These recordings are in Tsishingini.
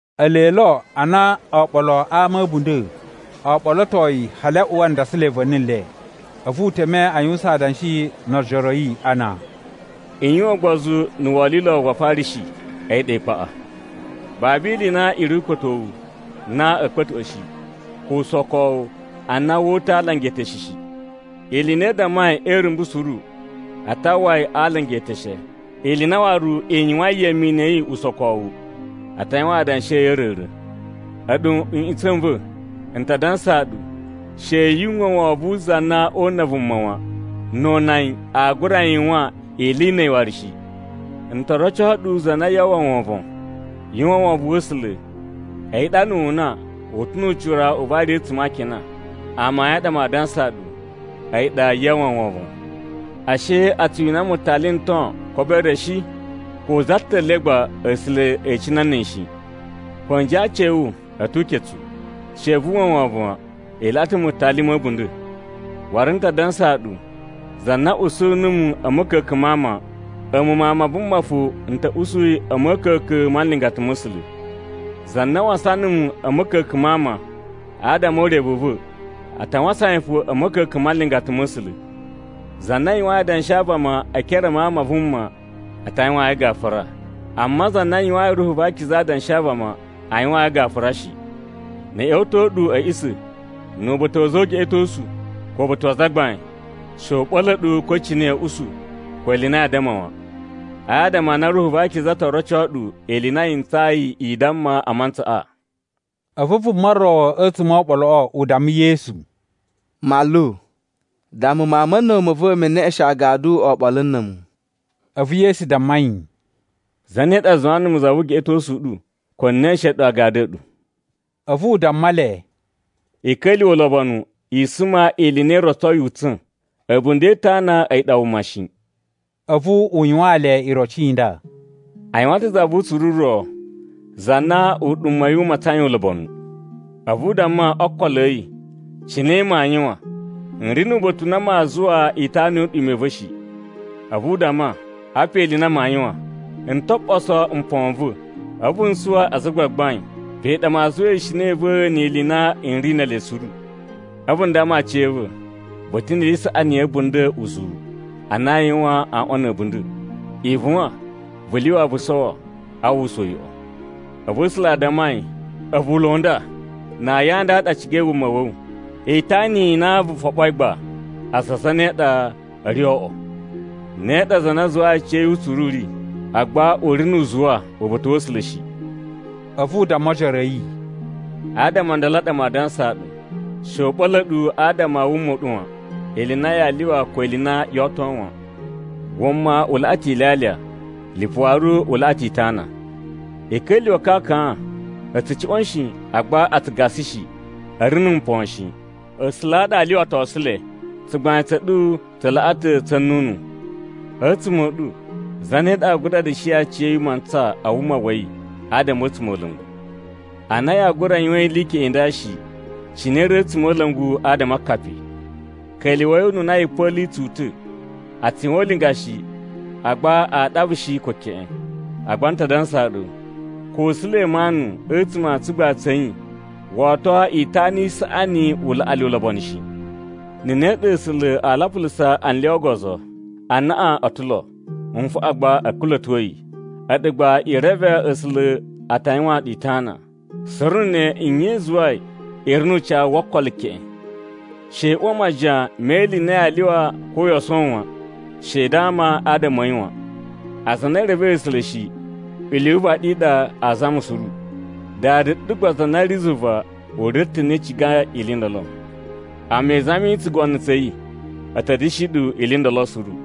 Ele lo ana oɓolo a ama a̱ a̱bunda̱ o ɓolotoi hali a uwa ndasalai va̱ni le. A̱vu u teme a yuwusan adanshi no ojoro a̱ yi ana, “I yuwan ugbozu na̱ wolilo wa Afarishi, a̱yi ɗa ikpaꞌa. Babu ili i na i ri ukpa̱towu na a̱ kpa̱tuꞌwa̱ shi, ko usokowu a na woo uta̱ a alanga e eteshe shi. Ili i na i dammai e irumbu suru, a ta uwwa yi a alanga eteshe. Ili i na waru i yuwain yemenu ya̱ yi usokowu, a ta yuwan adanshi a̱ yi a̱ a̱ra̱ra̱. “A̱ɗu nꞌutsa̱ n va̱, n ta dansaa ɗu, she yu uwwa wovon wu za na oo una vuma wan, no o una yi aa gura yuwan ili i na̱ a̱yi waru shi. N to roco ɗu za na yaa uwwa wovon. Yu uwwa wovon wa̱ A̱sula̱ a̱yi ɗa na̱ wu una, u ta̱ nu ucira u vari a̱tsuma̱ a akina. Amayun a ɗa maa dansaa ɗu, a̱yi ɗa yaa uwwa wovon. “Ashe a tsu wina mutali n ton kobo re shi? Ko za ta̱ le gba A̱sula̱ e icina na̱ a̱yi shi. Ko a̱nji a aaci a̱ wu a̱ tu uketsu. She yu uwwa wovon wan, i laꞌa ta̱ mutali ma̱ a̱bunda̱. “Waru n ta dansaa ɗu, za na usu numu a̱ ma̱ka̱ka̱n ma ama, a̱mu Mawun ma Vuma fo n ta̱ usu yi a̱ ma̱ka̱ka̱n ma nlingata ma̱ A̱sula̱. Za na wasan numu a̱ ma̱ka̱ka̱n ma ama, adama o urevu u va̱, a ta wasan yi fo a̱ ma̱ka̱ka̱n ma nlingata ma̱ A̱sula̱. Za na yuwain adanshi a vama e ekere a Mawun ma Vuma a ta yuwaan yi gafura, amma za na yuwayin Ruhu va Akiza adanshi a vama, aa yuwaan yi gafura shi. “Na̱ a̱ ꞌya̱wa̱to ɗu a̱ a̱ꞌisa̱, nu uba̱ta̱ wa̱ a̱za̱ o ugeꞌetosu, ko uba̱ta̱ wa azagbain, she u ɓa̱la̱ ɗu ko cine ya̱a̱ usu, ko ili i na yaa damma wan. Adama a na Ruhu va Akiza to roco ɗu ili i na yi ntsayi i damma a mantsaꞌa.” A̱vu vuma ro a̱tsuma̱ o oɓoloꞌo u damma Yesu, “Manlu, damma mawun ma̱ a̱na̱wu ma̱ va̱ me neꞌeshen agadu oɓolo na̱ a̱mu.” A̱vu Yesu damma yi, “Zane ɗa zuwa numu za vu ugeꞌetosu u ɗu, ko n neꞌeshen ɗu agadu a̱ ɗu?” A̱vu u damma le, “I ka̱lyuwa̱ ulobonu, i suma ili i na i rotsoi utsa̱n. A̱bunda̱ e itana a̱yi ɗa wuma shi.” A̱vu u yuwaan le iroci i nda, “A yuwan ta̱ za vu utsuru u ro, za na uɗuma̱ wa̱ yi u matsain ulobonu. A̱vu u damma o ookolo a̱ yi, ‘Cine maa yuwan? N ri nu uba̱ta̱ u na maa zuwa itana yu uɗuma̱ i va̱ shi.’ A̱vu u damma, ‘Apa ili i na maa yuwan. N to ɓoso mpon n va̱, a̱vu n suwa aza a gbagbain, pe ɗa maa zuwa ishina i va̱ ni ili i na n ri ne ele suru. A̱vu n damma aciya̱va̱, “Vu ta̱ ni ili i saꞌani ya̱ a̱bunda̱ uzuwu, a na aa yuwan wu aꞌwan a̱ a̱bunda̱. Ivuwan, vu lyuwa vu sowo, a uwwusa uyoꞌo.” ’ “A̱vu A̱sula̱ a damma yi, ‘A̱vu ulo u nda! Na ayin a nda a ɗa a cigai wuma wa̱ wu. Itana i na vu foɓoi gba, aza a zane a ɗa a̱ ri o oꞌwo?’ “Ne ɗa za na zuwayi aciya̱yi utsuru u ri, agba u ri nu uzuwa uba̱ta̱ wa̱ A̱sula̱ shi.” A̱vu u damma ojoro a̱ yi, “Adama o ndolo a ɗa maa dansaa ɗu, she u ɓa̱la̱ ɗu adama a wuma u ɗu wan, ili i na yaa lyuwa, ko ili i na yoo oto wan. Wuma u laꞌa ta̱ ilyalya, lipu waru u laꞌa ta̱ itana. I ka̱lyuwa̱ akakan: a̱ tsu cuꞌwa̱n shi, agba a tsu gasa shi, a̱ ri na̱ mpon shi. A̱sula̱ a ɗa a lyuwatosu le. Tsugbain tsa̱ ɗu tsa laꞌa ta̱ tsa̱ nnunu! A̱tsuma̱ a̱ ɗu zane ɗa aa gura da̱shi aciya̱yi mantsa a wuma wa̱ yi adama a̱ a̱tsumola̱ngu? Ana yaa gura yuwan ili i keꞌen i nda shi, cine i ri a̱tsumola̱ngu adama a akapi? “Ka̱lyuwa̱i ununa yipa̱lu i tsu uta̱. A tsu yuwan ulinga shi agba aa ɗava shi ko keꞌen. Agba n ta dansaa ɗu, ko Sulemanu a̱tsuma̱ a tsugbain tsa̱ yi wo oto itana i saꞌani u laꞌa le ulobonu shi. Na̱ ne ɗa A̱sula̱ aa lapulusa anlya o ogozo, anaꞌan u ta̱ lo, nfaꞌan gba a̱ kula̱to yi. A̱ɗu gba i reve A̱sula̱ a ta yuwaan ɗu itana. Suru na̱ ne nye i zuwai i ri nu ucawu wo okolo keꞌen? “She i uwa majiyan me ili i na yaa lyuwa ko yoo sowo wan, she i dama adama a̱ yi wan. Aza a na e revei A̱sula̱ shi ili yu uvaɗi i ɗa a zama suru, Dada ɗu gba za na ri zuva u reve ta̱ a na i cigai ili i ndolo. Amma i zami tsugono tsa̱ yi, a̱ ta̱ da̱shi ɗu ili i ndolo suru.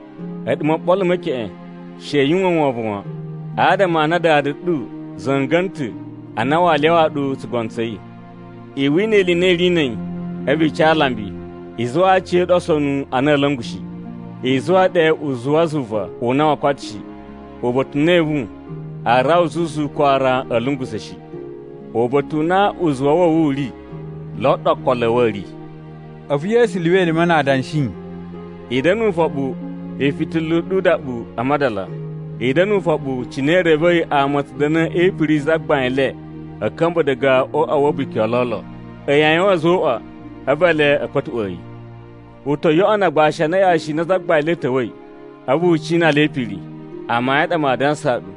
“A̱ɗu moɓolo me keꞌen, she yu uwwa wovon wan, adama a na Dada ɗu za̱nga̱na̱ ta̱ a na waa lyawaa ɗu tsugono tsa̱ yi. I wina ili i na i ri na̱ a̱yi, a̱vu i ca alambi, i zuwaa aciya̱ɗu osonu a na a̱a̱ la̱nga̱ shi, i zuwa ɗe uzuwa zuva u na woo koto shi, uba̱ta̱ u na evu aa rawa zuzu ko aran a̱a̱ lungusa̱ shi. Uba̱ta̱ u na uzuwa wa̱ wu u ri lo ɗa okolo a̱ wu a̱ ri.” A̱vu Yesu lyuwa elime na adanshi, “I da̱na̱ ufoɓu, ifitila i ɗu udaɓu a madala. I da̱na̱ ufoɓu cine i revei ama a̱ tsu da̱na̱ e ipiri yi zagbain le a̱ ka̱mba̱ diga o uꞌwa wa̱ a̱buki o lolo. A̱yi a yuwan a̱zoꞌwa, a̱vu ele a̱ kpa̱tuꞌwa̱a̱ yi. U to yoꞌono agbashi a na yashi i na zagbain le ta̱wa̱i, a̱vu u cina le e ipiri. Amayun a ɗa maa dansaa ɗu,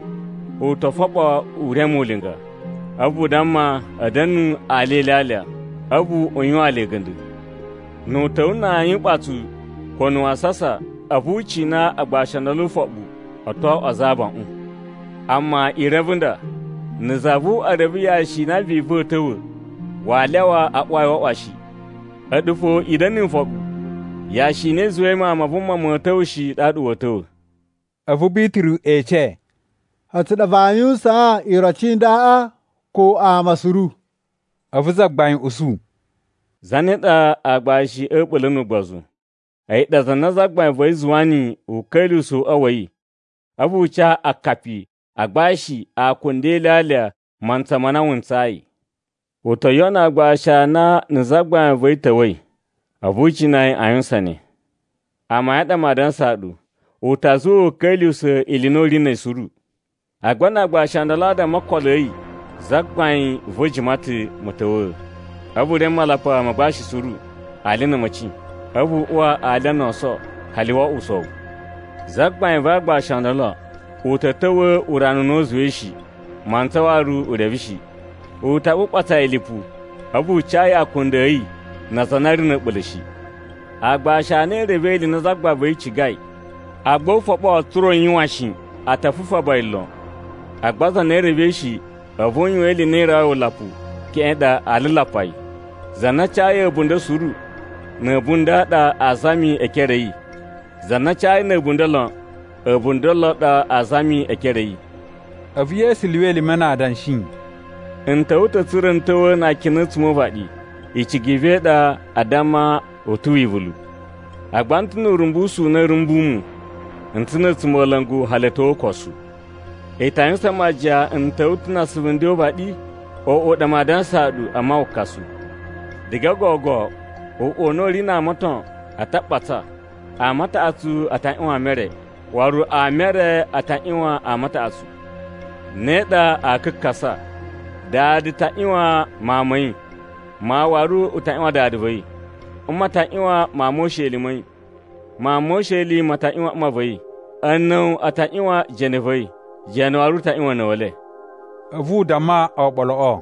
u to foɓo u reme ulinga, a̱vu u damma a̱ da̱nu alya e ilyalya, a̱vu u yuwaan le a̱ga̱nda̱. Nu u ta̱wa̱ na ayin uɓatsu ko na̱ wasasa, a̱vu u cina agbashi o ndolo ufoɓu, o to oꞌwo aza a abaꞌun. Amma i reve nda: Na̱ za vu uꞌwa reve yashi i na vivu a̱a̱ ta̱wa̱, waa lyawa a uwa yi o uꞌwa shi. A̱ɗu fo i da̱na̱ ni ifoɓi, yashi i na i zuwai Mawun ma Vuma ma̱a̱ ta̱wa̱ shi ɗaɗa wa̱a̱ ta̱wa̱.” A̱vu Bituru ece, “A̱tsu ɗa vaa yuwusaan iroci i ndaꞌa, ko ama suru?” A̱vu Zagbain usu, “Zane ɗa aagbashi a̱ a̱ɓula̱ nu ugbozu? A̱yi ɗa za na zagbain va̱ yi zuwa niyi u ka̱lyuwusa̱ uꞌwa wa̱ yi, a̱vu u ca akapi a agbashi akunda e ilyalya mantsa ma na wu ntsayi. U to yoꞌono aagbashi a na na̱ zagbain va̱ yi ta̱wa̱i, a̱vu u cina yi a yuwusan ne. Amayun a ɗa maa dansaa ɗu, u ta zuwa u ka̱lyuwusa̱ ili i na u ri na̱ yi suru. Agba na aagbashi o ndolo a damma o ookolo a̱ yi, ‘Zagbain va̱ jima ta̱ ma̱ta̱wa̱a̱.’ A̱vu u reme malapa ma agbashi suru, ali na̱ a̱ma̱ci. A̱vu u uwa alya no oso hali wo oꞌwo usowu. Zagbain va aagbashi o ndolo, u ta̱ ta̱wa̱ urana u na u zuwai shi, mantsa waru u reve shi. U ta ɓuɓatsa yi lipu, a̱vu u ca yi akunda a̱ yi na aza a na a̱ ri na̱ a̱ɓula̱ shi. “Aagbashi a na e revei ili i na zagbain va̱ yi cigai, agba u foɓo tsa̱ra̱ u yuwan shi, a ta fufaba yi lon. Agba za na revei shi, a̱vu u yuwan ili i na i rawai wulapu, keꞌen ɗa aa lulapa yi. Za na a cayi a̱bunda̱ suru, na̱ a̱bunda̱ a ɗa aa zami e ekere a̱ yi. Za na a cayi na̱ a̱bunda̱ lon, a̱bunda̱ lon a ɗa aa zami e ekere a̱ yi.” A̱vu Yesu lyuwa elime na adanshi, “N ta̱wa̱ ta̱ tsa̱ra̱ n ta̱wa̱a̱ na akina a̱tsuma̱ o uvaɗi, icigi i va̱ i ɗa a damma u ta̱ wivulu! Agba n ta̱ nu urumbusu u na a̱a̱ rumbu mu, n ta̱ na̱ a̱tsumola̱ngu hali a̱ tyo o ukosu. I ta yuwusan majiyan n ta̱wa̱a̱ ta̱ na asuvu nden o uvaɗi? Oꞌo ɗa maa dansaa ɗu, amma wukasu. Diga gogo uꞌwa u na u ri na ama o ton a ta ɓatsa: ama taꞌatsu a ta ꞌyuwan ama e re, waru ama e re a ta ꞌyuwan ama a taꞌatsu. Ne ɗa aa kakasa. Dada ta ꞌyuwan mawun ma̱ yi, mawun waru u ta ꞌyuwan dada va̱ yi. Mma ta ꞌyuwan mawun mo usheli ma̱ yi, mawun mo usheli ma ta ꞌyuwan mma va̱ yi. A̱na̱wa̱ a ta ꞌyuwan jene va̱ yi, jene waru u ta ꞌyuwan a̱na̱wa̱le.” A̱vu u damma oɓoloꞌo: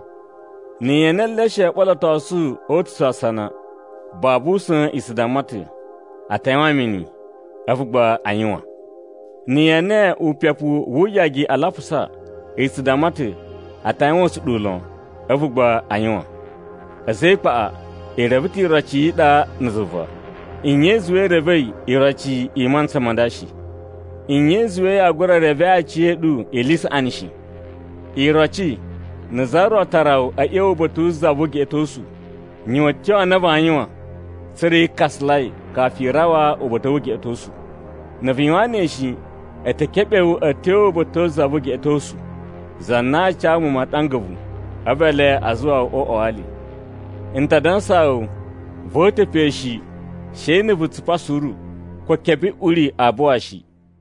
“Na̱ ye ene eleshe o ɓolotosu o uta̱su asana, babu usa̱n i tsu damma ta̱, ‘A ta yuwan mini.’ A̱vu gba a yuwan. Na̱ ye ene upepu wu uyagi a lapusa, i tsu damma ta̱, ‘A ta yuwan usuɗuwu lon.’ A̱vu gba a yuwan. A̱za̱ e ikpaꞌa, i reve ta̱ iroci yi iɗa na̱ zuva. Nye i zuwai i revei iroci i mantsa ma nda shi?” “Nye i zuwai yaa gura revee aciya̱ɗu ili i saꞌani shi? Iroci, na̱ za ro tara wu a̱ ꞌya̱wa̱ uba̱ta̱ wu za vu ugeꞌetosu, yuwan a̱tyo a na vaa yuwan tsa̱ra̱ yi kakasalai kafu i rawa uba̱ta̱ wu ugeꞌetosu. Na̱ vu yuwan ne shi, a̱ ta̱ keɓe wu a̱ tyo uba̱ta̱ wu za vu ugeꞌetosu, za na aa ca muwun maɗanga a̱vu, a̱vu ele a zuwa wu o uꞌwa wa ali. N ta dansaa wu, voo uta̱ pe shi, she na̱ vu tsupa suru, ko kebuꞌuri aa buwa shi.”